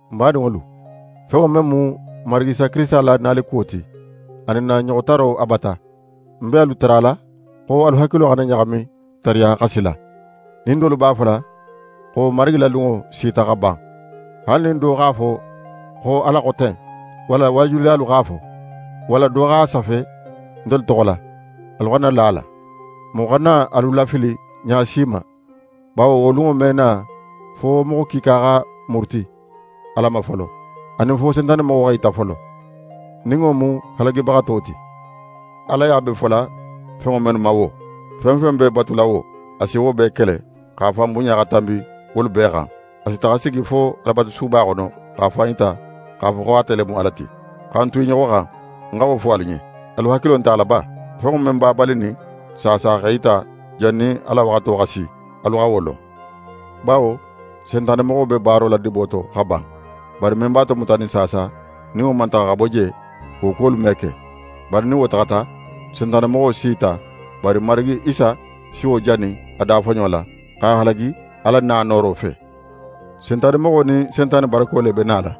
N badinŋolu, fenŋo men mu n Marigi Isa Kirisita la nalikuwo ti, anin n na ɲoxotaro a bata, n be alu tarala xo alu hakilo xana ɲaxami tariya xa sila, nin dolu b'a fola xo Marigi la lunŋo sita xa ban. Haali nin do x'a fo xo Ala xo ten, walla waajulilalu x'a fo, walla do x'a safe ntelu toxo la, alu xana la a la. Moxo xana alu lafili ɲa si ma, bawo wo lunŋo me na fo moxo kiika xa muruti Ala ma folo, anin fo Sentanemoxo x'é yita folo, nin wo mu halagibaxato ti. Alaya be fola fenŋo mennu ma wo, fen fen be batula wo, a si wo bee kele, x'a fan bunɲa xa tanbi wolu bee xan. A si taxa sigi fo Alabatusuba xono, x'a fan yita x'a fo xo ate le mu Ala ti. Xa n tu i ɲoxo xan, ń xa wo fo alu ɲen. Alu hakilo nte a la ba? Fenŋo men b'a balinin saasa x'é yita jannin a la waxato xa si, alu xa wo lon. Bawo Sentanemoxo be baaro la dibo to xa ban, bari men b'a tomutanin saasa, nin wo man taxa xa bo je, wo kuwolu me ke. Bari nin wo taxata, Sentanemoxo s'í yita; bari Marigi Isa si wo jani a dafoɲo la, x'a halagi a la na nooro fe. Sentanemoxo nin Sentane barako le be nala.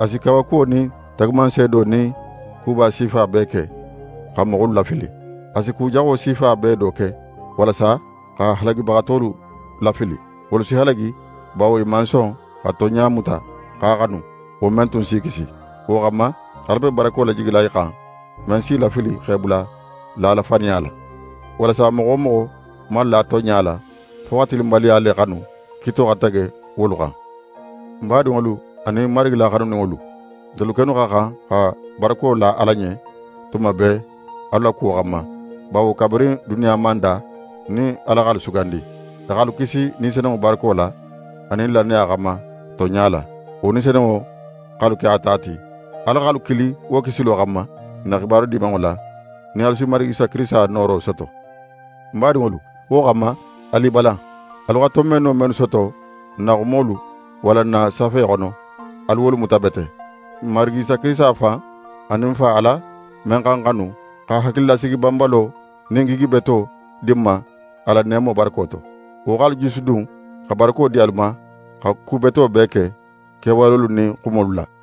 A si kawakuwo nin taagumanseedo nin kuba sifa bee ke, xa moxolu lafili. A si ku jaxo sifa bee do ke, walasa xa halagibaxatolu lafili. Wolu si halagi, bawo i man son xa tonɲa muta x'a xanu, wo men tun s'i kisi. Wo xanma, Ala be barako lajigila i xan, men s'i lafili x'e bula lala faniya la, walasa moxo wo moxo man la tonɲa la, fo xa tilinbaliya le xanu, kiito xa tege wolu xan. N badinŋolu anin Marigi la xanuninŋolu, ntelu kennu xa xan xa barako la Ala ɲen tuma bee alu la kuwo xanma, bawo kabirin duniya man da nin Ala x'alu sugandi. A x'alu kisi Ni Senunŋo barako la anin lannaya xanma tonɲa la. Wo Ni Senunŋo x'alu ke a ta ti. Ala x'alu kili wo kisilo xanma n na xibaru Dimanŋo la, nin alu si Marigi Isa Kirisita nooro soto. N badinŋolu, wo xanma, alu i balan. Alu xa tonbenno mennu soto n na xumolu walla n na safe xono, alu wolu muta bete. N Marigi Isa Kirisita fan, anin N Fa Ala men xa n xanu, xa hakililasigi banbalo nin gigi beto di n ma a la neemo barako to, wo x'alu jusudun, xa barako di alu ma xa ku beto bee ke, kewalolu nin xumolu la.